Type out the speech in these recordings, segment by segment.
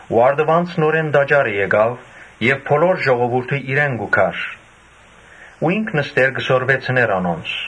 Երբ առտուն նորէն տաճարը եկաւ, բոլոր ժողովուրդը իրեն կու գար ու ինք նստեր կը սորվեցնէր անոնց։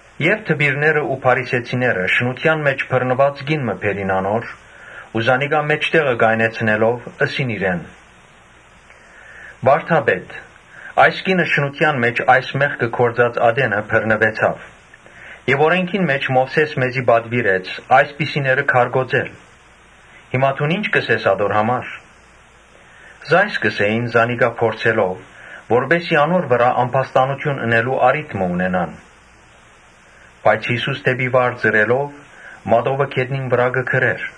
Դպիրներն ու փարիսեցիները շնութեան մէջ բռնուած կին մը բերին անոր ու զանիկա մէջտեղը կայնեցնելով՝ Ըսին իրեն. «Վա՛րդապետ, այս կինը շնութեան մեղքը գործած ատենը բռնուեցաւ։ Մովսէս օրէնքին մէջ մեզի պատուիրեց այսպիսիները քարկոծել։ Հիմա դուն ի՞նչ կ’ըսես ատոր համար»։ Ասիկա կ’ըսէին՝ զանիկա փորձելով, որպէս զի անոր վրայ ամբաստանութիւն ընելու առիթ մը ունենան. բայց Յիսուս դէպի վար ծռելով՝ մատովը գետնին վրայ կը գրէր.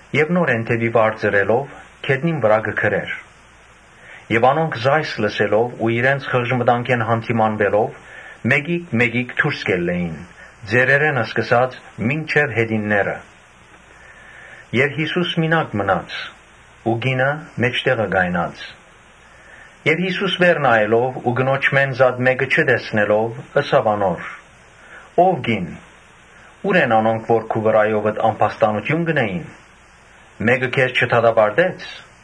Եւ նորէն ծռելով՝ գետնին վրայ կը գրէր։ Անոնք այս լսելով ու իրենց խղճմտանքէն յանդիմանուելով՝ մէկիկ մէկիկ դուրս ելան, ծերերէն սկսած մինչեւ յետինները։ Յիսուս մինակ մնաց ու կինը մէջտեղը կայնած։ Յիսուս վեր նայելով ու կնոջմէն զատ մէկը չտեսնելով՝ ըսաւ անոր. «Ո՛վ կի՛ն, ո՞ւր են անոնք, որ քու վրայովդ ամբաստանութիւն կ’ընէին. մէկը քեզ չդատապարտե՞ց»։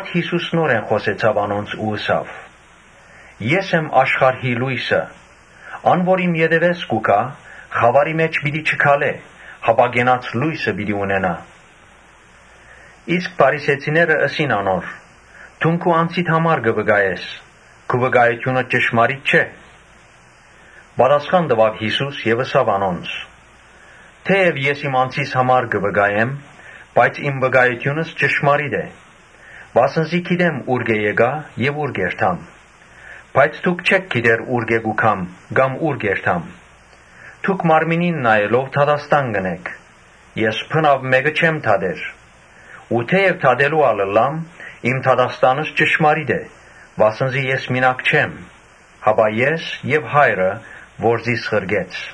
Յիսուս նորէն խօսեցաւ անոնց ու ըսաւ. «Ես եմ աշխարհի լոյսը. ան որ իմ ետեւէս կու գայ, խաւարի մէջ պիտի չքալէ, հապա կենաց լոյսը պիտի ունենայ»։ Իսկ փարիսեցիները ըսին անոր. «Դուն քու անձիդ համար կը վկայես, քու վկայութիւնդ ճշմարիտ չէ»։ Պատասխան տուաւ Յիսուս եւ ըսաւ անոնց. «Թէեւ ես իմ անձիս համար կը վկայեմ, բայց իմ վկայութիւնս ճշմարիտ է, վասն զի գիտեմ ուրկէ՞ եկայ եւ ո՞ւր կ’երթամ։ Իսկ դուք չէք գիտեր ուրկէ՞ կու գամ եւ ո՞ւր կ’երթամ։ Դուք մարմնին նայելով դատաստան կ’ընէք։ Ես բնաւ մէկը չեմ դատեր, Թէեւ դատելու ալ ըլլամ, իմ դատաստանս ճշմարիտ է. վասն զի ես մինակ չեմ, հապա ես եւ Հայրը, որ զիս ղրկեց։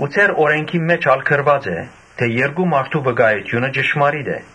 Ձեր օրէնքին մէջ ալ գրուած է թէ՝ ‘Երկու մարդու վկայութիւնը ճշմարիտ է’։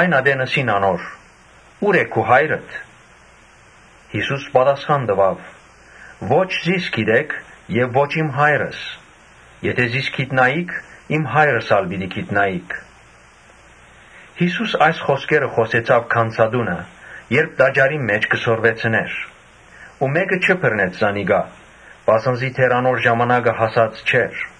Այն ատեն ըսին անոր. «Ո՞ւր է քու Հայրդ»։ Յիսուս պատասխան տուաւ. «Ո՛չ զիս կը ճանչնաք եւ ո՛չ՝ իմ Հայրս. եթէ զիս ճանչնայիք իմ հայրս ալ պիտի ճանչնայիք»։ Յիսուս այս խօսքերը խօսեցաւ գանձատունը՝ երբ տաճարին մէջ կը սորվեցնէր ու մէ՛կը չբռնեց զանիկա, վասն զի դեռ անոր ժամանակը հասած չէր։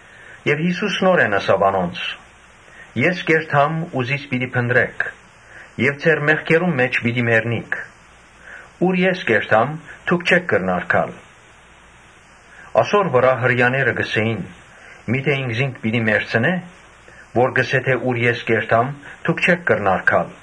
Յիսուս նորէն ըսաւ անոնց. «Ես կ’երթամ ու զիս պիտի փնտռէք եւ ձեր մեղքերուն մէջ պիտի մեռնիք։ Ուր որ ես կ’երթամ, դուք չէք կրնար գալ»։ Ասոր վրայ Հրեաները կ’ըսէին. «Միթէ ինքզինք պիտի մեռցնէ՞, որ կ’ըսէ թէ՝ ‘Ուր ես կ’երթամ, դուք չէք կրնար գալ’»։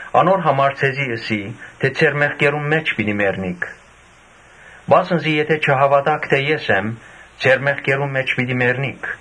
Անոր համար ձեզի ըսի թէ՝ ‘Ձեր մեղքերուն մէջ պիտի մեռնիք’, վասն զի եթէ չհաւատաք թէ ես Ան եմ, ձեր մեղքերուն մէջ պիտի մեռնիք»։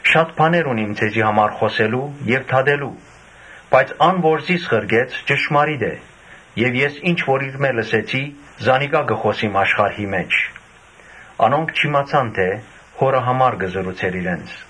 Շատ բաներ ունիմ ձեզի համար խօսելու եւ դատելու. բայց ան որ զիս ղրկեց՝ ճշմարիտ է եւ ես ինչ որ իրմէ լսեցի, զանիկա կը խօսիմ աշխարհի»։ Անոնք չիմացան թէ Հօրը համար կը խօսէր իրենց։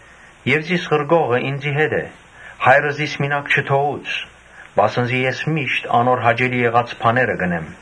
Եւ զիս ղրկողը ինծի հետ է. Հայրը զիս մինակ չթողուց, վասն զի ես միշտ անոր հաճելի եղած բաները կ’ընեմ»։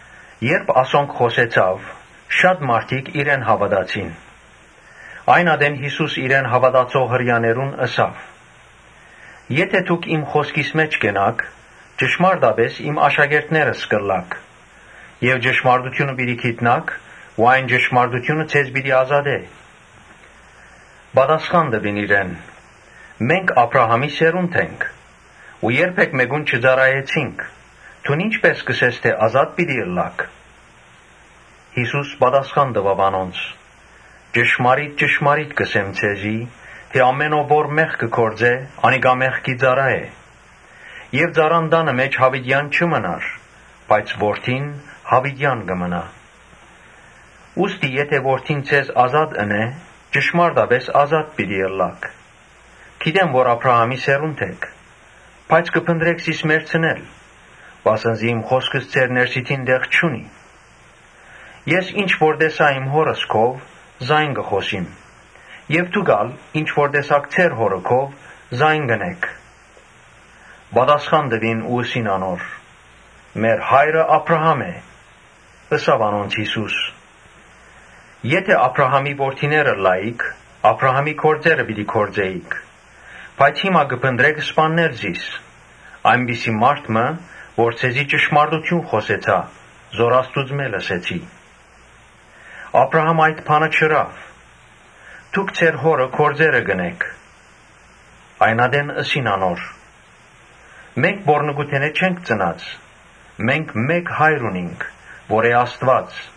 Երբ ասոնք խօսեցաւ, շատ մարդիկ իրեն հաւատացին։ Այն ատեն Յիսուս իրեն հաւատացող Հրեաներուն ըսաւ. «Եթէ դուք իմ խօսքիս մէջ կենաք, ճշմարտապէս իմ աշակերտներս կ’ըլլաք Եւ ճշմարտութիւնը պիտի գիտնաք ու այն ճշմարտութիւնը ձեզ պիտի ազատէ»։ Պատասխան տուին իրեն. «Մենք Աբրահամին սերունդն ենք ու երբե՛ք մէկուն չծառայեցինք. դուն ի՞նչպէս կ’ըսես թէ՝ «Ազատ պիտի ըլլաք’»։ Յիսուս պատասխան տուաւ անոնց. «Ճշմարիտ ճշմարիտ կ’ըսեմ ձեզի թէ ‘Ամէն ով որ մեղք կը գործէ, անիկա մեղքի ծառայ է’։ Եւ ծառան տանը մէջ յաւիտեան չի մնար, բայց որդին յաւիտեան կը մնայ։ Ուստի եթէ Որդին ձեզ ազատ ընէ, ճշմարտապէս ազատ պիտի ըլլաք։ Գիտեմ թէ Աբրահամին սերունդն էք, բայց կը փնտռէք զիս մեռցնել վասն զի իմ խօսքս ձեր ներսիդին տեղ չունի։ Ես ինչ որ տեսայ իմ Հօրս քով՝ զայն կը խօսիմ եւ դուք ալ ինչ որ տեսաք ձեր հօրը քով՝ զայն կ’ընէք»։ Պատասխան տուին ու ըսին անոր. «Մեր հայրը Աբրահամն է»։ Ըսաւ անոնց Յիսուս. «Եթէ Աբրահամին որդիները ըլլայիք, Աբրահամին գործերը պիտի գործէիք։ Բայց հիմա կը փնտռէք սպաննել զիս, այնպիսի մարդ մը, որ ձեզի ճշմարտութիւնը խօսեցայ, որ Աստուծմէ լսեցի։ Աբրահամ այդ բանը չըրաւ։ Դուք ձեր հօրը գործերը կ’ընէք»։ Այն ատեն ըսին անոր. «Մենք պոռնկութենէ չենք ծնած, մենք մէկ Հայր ունինք, որ է Աստուած»։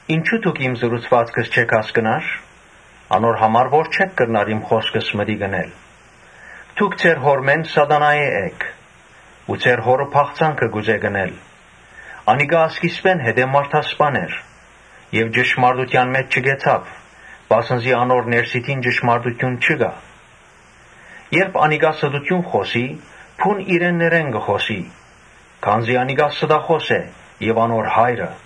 Ինչո՞ւ դուք իմ խօսքերս չէք հասկնար։ Անոր համար որ չէք կրնար իմ խօսքիս մտիկ ընել։ Դուք ձեր հօրմէն Սատանայէն էք ու ձեր հօրը բաղձանքը կ’ուզէք ընել։ Անիկա սկիզբէն մարդասպան էր եւ ճշմարտութեան մէջ չկեցաւ, վասն զի անոր ներսիդին ճշմարտութիւն չկայ։ Երբ անիկա ստութիւն խօսի, բուն իրեններէն կը խօսի, քանզի անիկա ստախօս է եւ անոր հայրը։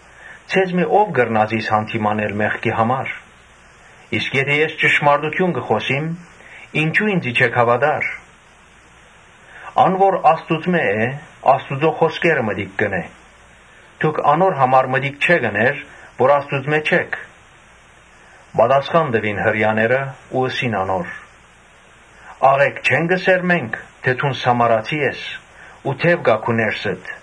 Ձեզմէ ո՞վ կրնայ զիս յանդիմանել մեղքի համար. իսկ եթէ ես ճշմարտութիւնը կը խօսիմ, ինչո՞ւ ինծի չէք հաւատար։ Ան որ Աստուծմէ է, Աստուծոյ խօսքերը մտիկ կ’ընէ։ Դուք անոր համար մտիկ չէք ըներ, քանզի Աստուծմէ չէք»։ Պատասխան տուին Հրեաները ու ըսին անոր. «Աղէկ չե՞նք ըսեր մենք՝ թէ դուն Սամարացի ես ու դեւ կայ քու ներսդ»։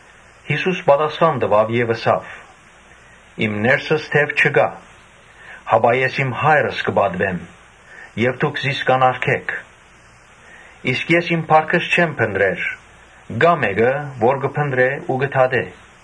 Յիսուս պատասխան տուաւ եւ ըսաւ. «Իմ ներսս դեւ չկայ, հապա ես իմ Հայրս կը պատուեմ, բայց դուք զիս կ’անարգէք։ Իսկ ես իմ փառքս չեմ փնտռեր։ Կայ մէկը, որ կը փնտռէ ու կը դատէ։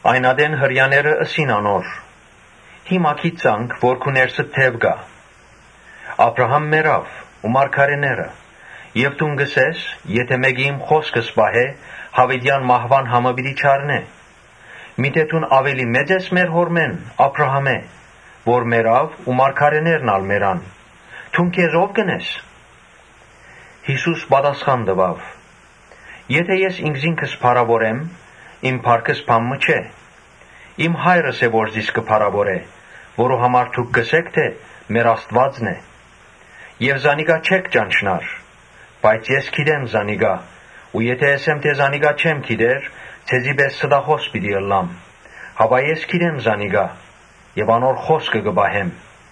Այն ատեն Հրեաները ըսին անոր. «Հիմա գիտցանք թէ քու ներսդ դեւ կայ։ Աբրահամ մեռաւ ու մարգարէներն ալ եւ դուն կ’ըսես. ‘Եթէ մէկը իմ խօսքս պահէ, յաւիտեան մահուան համը պիտի չառնէ’։ Միթէ դուն աւելի՞ մեծ ես մեր հօրմէն՝ Աբրահամէն, որ մեռաւ ու մարգարէներն ալ մեռան. դուն քեզ ո՞վ կը կարծես»։ Յիսուս պատասխան տուաւ. «Եթէ ես ինքզինքս փառաւորեմ, իմ փառքս բան մը չէ։ Իմ Հայրս է, որ զիս կը փառաւորէ, որուն համար դուք կ’ըսէք թէ Ոմանք, ՁերՄեր Աստուածն է, Բայց զանիկա չէք ճանչնար, բայց ես կը ճանչնամ զանիկա ու եթէ ըսեմ թէ զանիկա չեմ ճանչնար, ձեզի պէս ստախօս պիտի ըլլամ. մինչդեռ ես կը ճանչնամ զանիկա եւ անոր խօսքը կը պահեմ։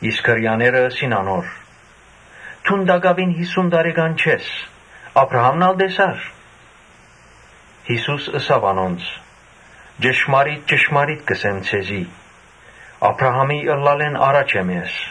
Իսկ Հրեաները ըսին անոր. «Դուն տակաւին յիսուն տարեկան չկաս, Աբրահա՞մն ալ տեսար»։ Յիսուս ըսաւ անոնց. «Ճշմարիտ ճշմարիտ կ’ըսեմ ձեզի, Աբրահամին ըլլալէն առաջ եմ ես»։